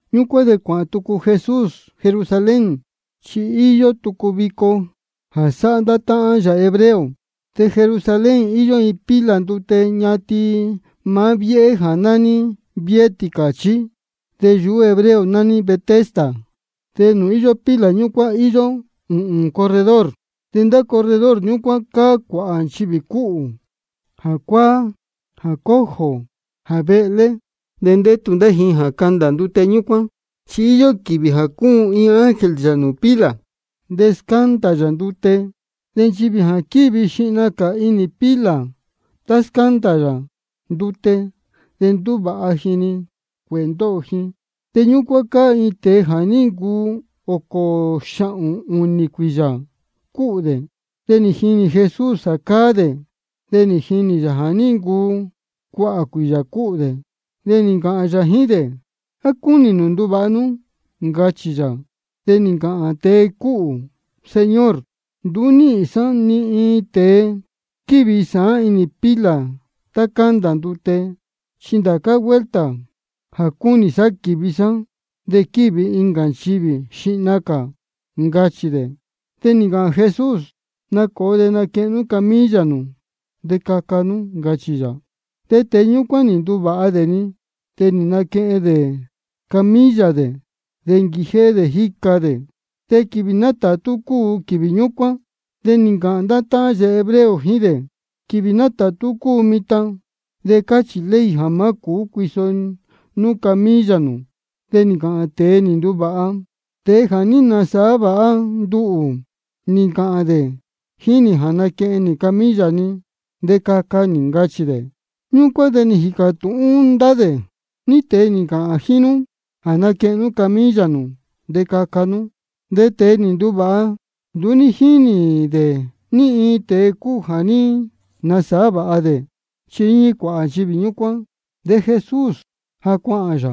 Ñúcuán de cuāhān tucu Jesús Jerusalén, chi íyó tucu vico jā sáhá ndá táhán yā hebreo. De Jerusalén íyó iin pila ndute ñatin maá viéhé jā nání viéhé tīcāchí. De yuhú hebreo nání Betesda. De nūū íyó pila ñúcuán íyó ūhūn corredor. De ndá corredor ñúcuán cáá cuāhā nchivī cúhū, jā cuāá, jā cojo, jā vehlé. De ndétu ndá ji jā candā ndute ñúcuán. Chi íyó quīvī jā cúun iin ángel yā nūū pila, de scándā yā ndute. De nchivī jā quívi xihna cā inī pila tá scándā yā ndute, de ndúvāha ji nā-ni cuēhē ndóho ji. De ñúcuán cáá iin tēe jā ní ncuu ōcō xāhōn ūnī cuīyā cúhū dē. De nī jinī Jesús jā cáá dē, de nī jinī yā jā ní ncuu cuāhā cuīyā cúhū dē. De nī ncāhān yā jíín dē: ¿A cúnī nū nduvāha nú? ncachī yā. De nī ncāhān tēe cúhū: Señor, nduú níhīn sá ni iin tēe squívi sāán inī pila tá cándā ndute. Chi ndācá vuelta jā cúnī sá quīvi sá, de quívi-ni incā nchivī xihna cā, ncachī dē. De nī ncāhān Jesús: Nacōo de naquehen nú camilla nū de caca nú, ncachī yā. De tēe ñúcuán nī nduvāha dē-ni. De nī naquehen dē camilla dē, de nī nquijéhé dē jíca dē. De quīvī nátātú cúu quīvī ñúcuán. De nī ncāhān ndá táhán dē hebreo jíín dē: Quīvī nátātú cúu mitan. De cáchī ley jā má cūú cuiso nú camilla nū. De nī ncāhān tēe nī nduvāha: Tēe jā ní nasāhá vāha nduhū, nī ncāhān dē jíín nī jā naquehen nī camilla ni de caca nī, ncachī dē. Ñúcuán de nī jīcā tūhún ndá dē: ¿Ní tēe nī ncāhān jíín nú jā naquehen nú camilla nū de caca nú? De tēe nī nduvāha, nduú jínī dē ní iin tēe cúu jā ní nasāhá vāha dē. Chi íñí cuāhā nchivī ñúcuán, de Jesús ja cuāhān yā.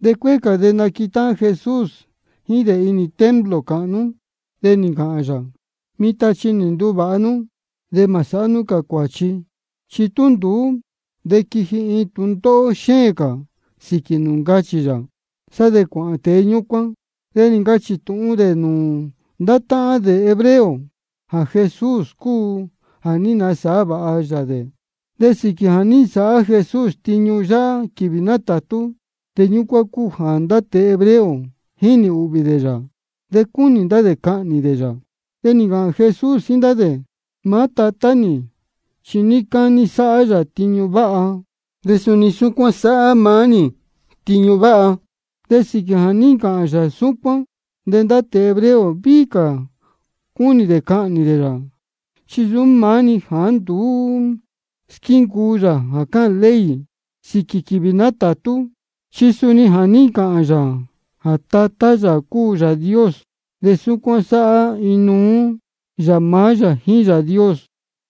De cuéé cā de nī naquetáhán Jesús jíín dē inī templo cāhnú. De nī ncāhān yā: Mitan chi nī nduvāha nú. De mā sāhá cā nū cuāchi, chi tú nduú, de quiji iin tūndóhó xéēn cā sīquī nū, ncachī yā. Sá de cuāhān tēe ñúcuán de nī ncachī tūhun dē nūū ndá táhán dē hebreo jā Jesús cúu jā ní nasāhá vāha yā dē. De sīquī jā ní nsāhá Jesús tiñu yáhá quīvī nátātú, jā ñúcuán cúu jā ndá tēe hebreo jínī ūhvī dē yā, de cúnī ndá dē cahnī dē yā. De nī ncāhān Jesús jíín ndá dē: Maá Tatá nī chi níí cání sáhá yā tiñu váha, de suni súcuán sáhá maá nī tiñu váha. De sīquī jā ní ncāhān yā súcuán, de ndá tēe hebreo víhí cā cúnī dē cahnī dē yā. Chi nsūú maá-ni jāá nduú squíncuu yā jā cáhān ley sīquī quīvī nátātú, chi suni jā ní ncāhān yā jā Tatá yā cúu Yāā Dios de súcuán sáhá inuú yā maá yā jíín Yāā Dios.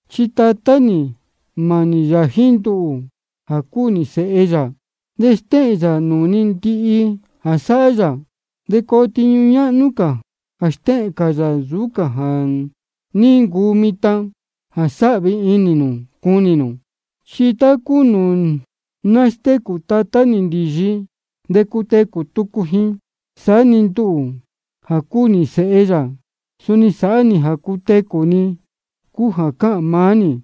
Chi Tatá nī mānī yā jíín nduhū jā cúu nī Sēhe yā, de stéhēn yā nūū ni ndihi jā sáhá yā. De coo tiñu ñáhnú cā jā stéhēn cā yā nsūú cā jā ní ncuu mitan, jā sāhvi inī ndá nú cunī nū. Chi tá cúu nūū nástécū Tatá nī ndīyi de cutecū tucu ji, saá-ni nduhū jā cúu nī Sēhe yā, suni sáhá nī jā cutecū ní-ni cúu jā cúnī maá nī.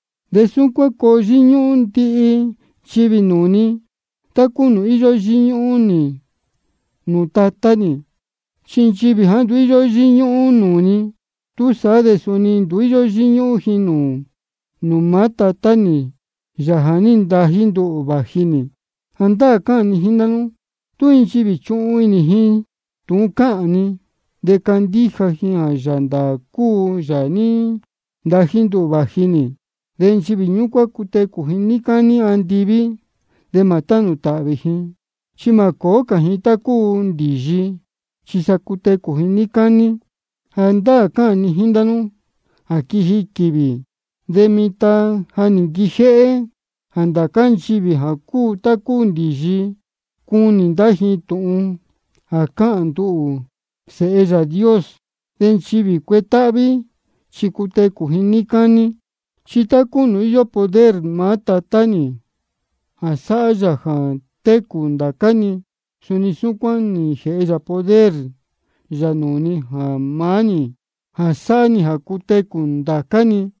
De súcuán de coo yíñúhún ndihi nchivī nūū ni, tá cúu nūū íyó yíñúhún ji nūū Tatá nī. De nchivī jāá nduú íyó yíñúhún nūū ni, túsaá de suni nduú íyó yíñúhún ji nūū maá Tatá nī, Yāā jā ní ntají nduhū vāji nī. Jāndáā cáhān ni jíín ndá nú: Tú iin nchivī chuhun inī ji tūhun cáhān ni, de candíja ji jā Yāā ndāā cúu Yāā jā ní ntají nduhū vāji nī, nchivī ñúcuán cutecū ji níí cání andiví, de mā tánū tāhvī ji. Chi mā cōó cā ji tá cúu ndīyi, chi sa cutecū ji níí cání. Jāndáā cáhān ni jíín ndá nú jā quiji quīvī, de mitan de ja nī nquijéhé, jā ndācá nchivī jā cúu tá cúu ndīyi, cuni ndá ji tūhun jā cáhān nduhū, Sēhe Yāā Dios. De nchivī cuetáhví chi cutecū ji níí cání. Chi tá cúu nūū íyó poder maá Tatá nī jā sáhá yā jā técū ndācá-ni, suni súcuán nī jēhe yā poder nūū maá nī jā sāhá nī jā cutecū ndācá-ni.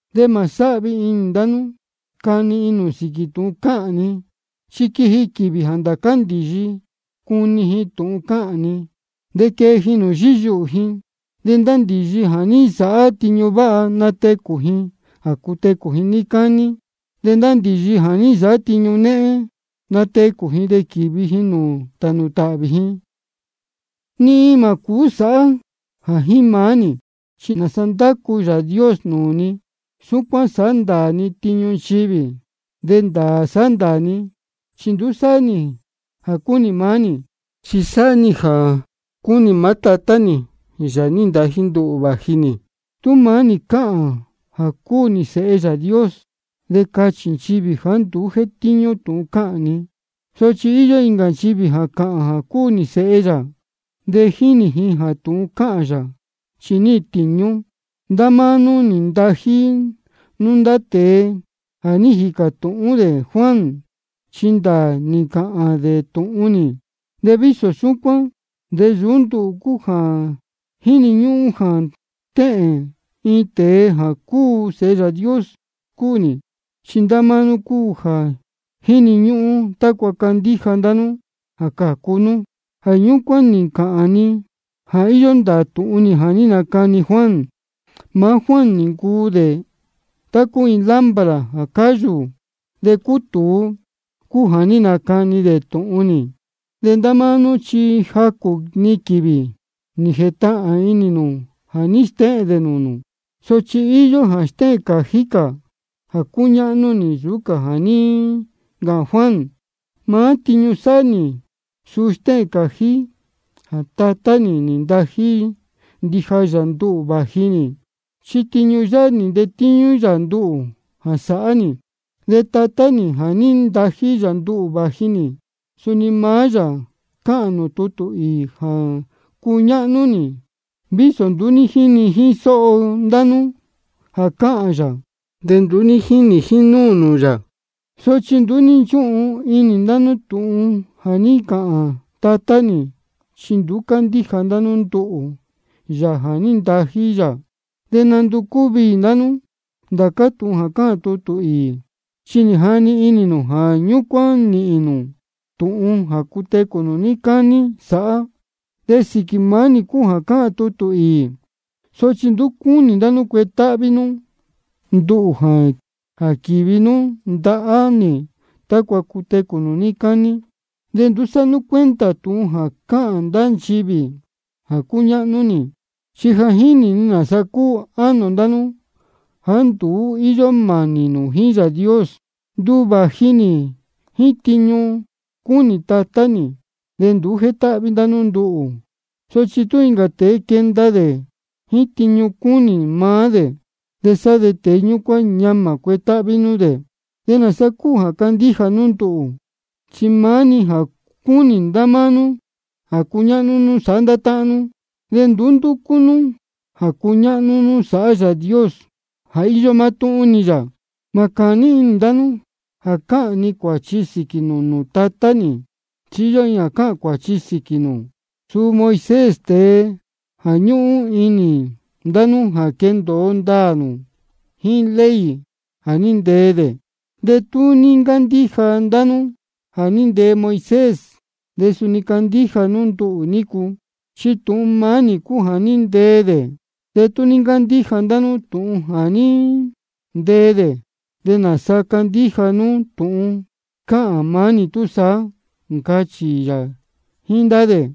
Mā sáhvi inī ndá nú cani inī nū sīquī tūhun cáhān ni. Chi quiji quīvī jā ndācá ndīyi cuni ji tūhun cáhān ni, de quee ji nūū yíyuhū ji. De ndá ndīyi jā ní nsāhá tiñu váha, natecū ji jā cutecū ji níí cání. De ndá ndīyi jā ní nsāhá tiñu néhén, natecū ji de quīvi ji nūū tānū tāhvī ji. Ni iin mā cūú sāhá nī jā maá nī. Chi nāsa ndácu Yāā Dios nūū ni, súcuán sándaā ni tiñu nchivī. De ndāā sándaā ni, chi nduú sáhá nī jā cúnī maá nī, chi sáhá nī jā cúnī maá Tatá nī, Yāā nī ntají nduhū vāji nī. Tú maá nī cāhān jā cúu nī Sēhe Yāā Dios, de cachī nchivī jāá nduú jétíñú tūhun cáhān ni. Sochi íyó incā jā cáhān jā cúu nī Sēhe yā. De jínī ni jā tūhun cáhān yā, chi níhīn tīñú. Ndá máá nú nī ntají nú ndá tēe jā ní jīcā tūhún dē Juan. De Juan chi ndāā nī ncāhān dē tūhun nī. De vísō súcuán de nsūú nduhū cúu jā jíni ñúhún jā stéhēn iin tēe jā Sēhe Yāā Dios cúu nī. Chi ndá máá nú cúu jā jíni ñúhún, tácua candíja ndá nú de cācu nú. Jā ñúcuán nī ncāhān ni jā íyó ndāā tūhun nī jā ní nacani Juan. Maá Juan nī ncuu dē tá cúu iin lámpara jā cáyū de cútūu, cúu jā ní nacani dē tūhun nī. De ndá máá nú chi jacū-ni quīvī nī jētahān inī nū jā ní stéhēn dē nūū nū. Sochi íyó jā stéhēn cājí cā jā cúñáhnú nī nsūú cā jā ní ncāhān Juan. Maá tiñu sáhá nī, suu stéhēn cājí jā Tatá nī nī ntají ndija yā nduhū vāji nī, chi tiñu yáhá nī ntetíñú yā nduhū jā sāhá nī. De Tatá nī jā ní ntají yā nduhū vāji nī, suni maá yā cáhān nūū tutū īī jā cúñáhnú nī, vísō nduú ní jíni jíín sóho ndá nú jā cáhān yā, de ni nduú ní jínī jínúū nū yā. Sochi nduú ní nchúhun inī ndá nú tūhun jā ní ncāhān Tatá nī, chi nduú cándíja ndá nú nduhū, Yāā jā ní ntají yā. De nánducú viī ndá nú ndācá tūhun cáhān tutū īī, chi jáni inī nū jā ñúcuán nīhīn nū tūhun jā cutecū nū níí cání sāhá. De sīquī maá nī cúu jā cáhān tutū īī. Sochi nduú cúnī ndá nú cuetáhví nú nduhū jā quīvi nú ndahá nī tácua cutecū nū níí cání. Nduú sáhá nī cuenta tūhun jā cáhān ndá nchivī jā cúñáhnú nī. Chi ja jínī ni nāsa cúu ánō ndá nú jāá nduú íyó mānī nū jíín Yāā Dios. Nduhū vāji nī jíín tiñu cúnī Tatá nī, de nduú jétáhví ndá nú nduhū. Sochi tú incā tēe quenda dē jíín tiñu cúnī maá dē, de sa tēe ñúcuán ñamā cuetáhví nú dē. ¿Nāsa cuu candíja ndá nú? Chi máni jā cúnī ndá nú jā cuñáhnú nú sāhá ndá táhán nú, de nduú ndúcú nú jā cuñáhnú nú sāhá Yāā Dios, jā íyó mátúhún-ni yā. Mā cāní inī ndá nú jā cāhān ni cuāchi sīquī nū nūū Tatá nī. Chi íyó iin jā cāhān cuāchi sīquī nū, suu Moisés, tēe jā ñúhún inī ndá nú jā quendōo ndāā nū jíín ley jā ní ntee dē. Chi tú ní ncándíja ndá nú jā ní ntee Moisés, de suni candíja nú nduhū nícu, chi tūhun maá nī cúu jā ní ntee dē. Te tú nduú cándíja ndá nú tūhun nī jā ní ntee dē, ¿de nāsa candíja nú tūhun cáhān maá nī túsaá? ncachī yā jíín ndá dē.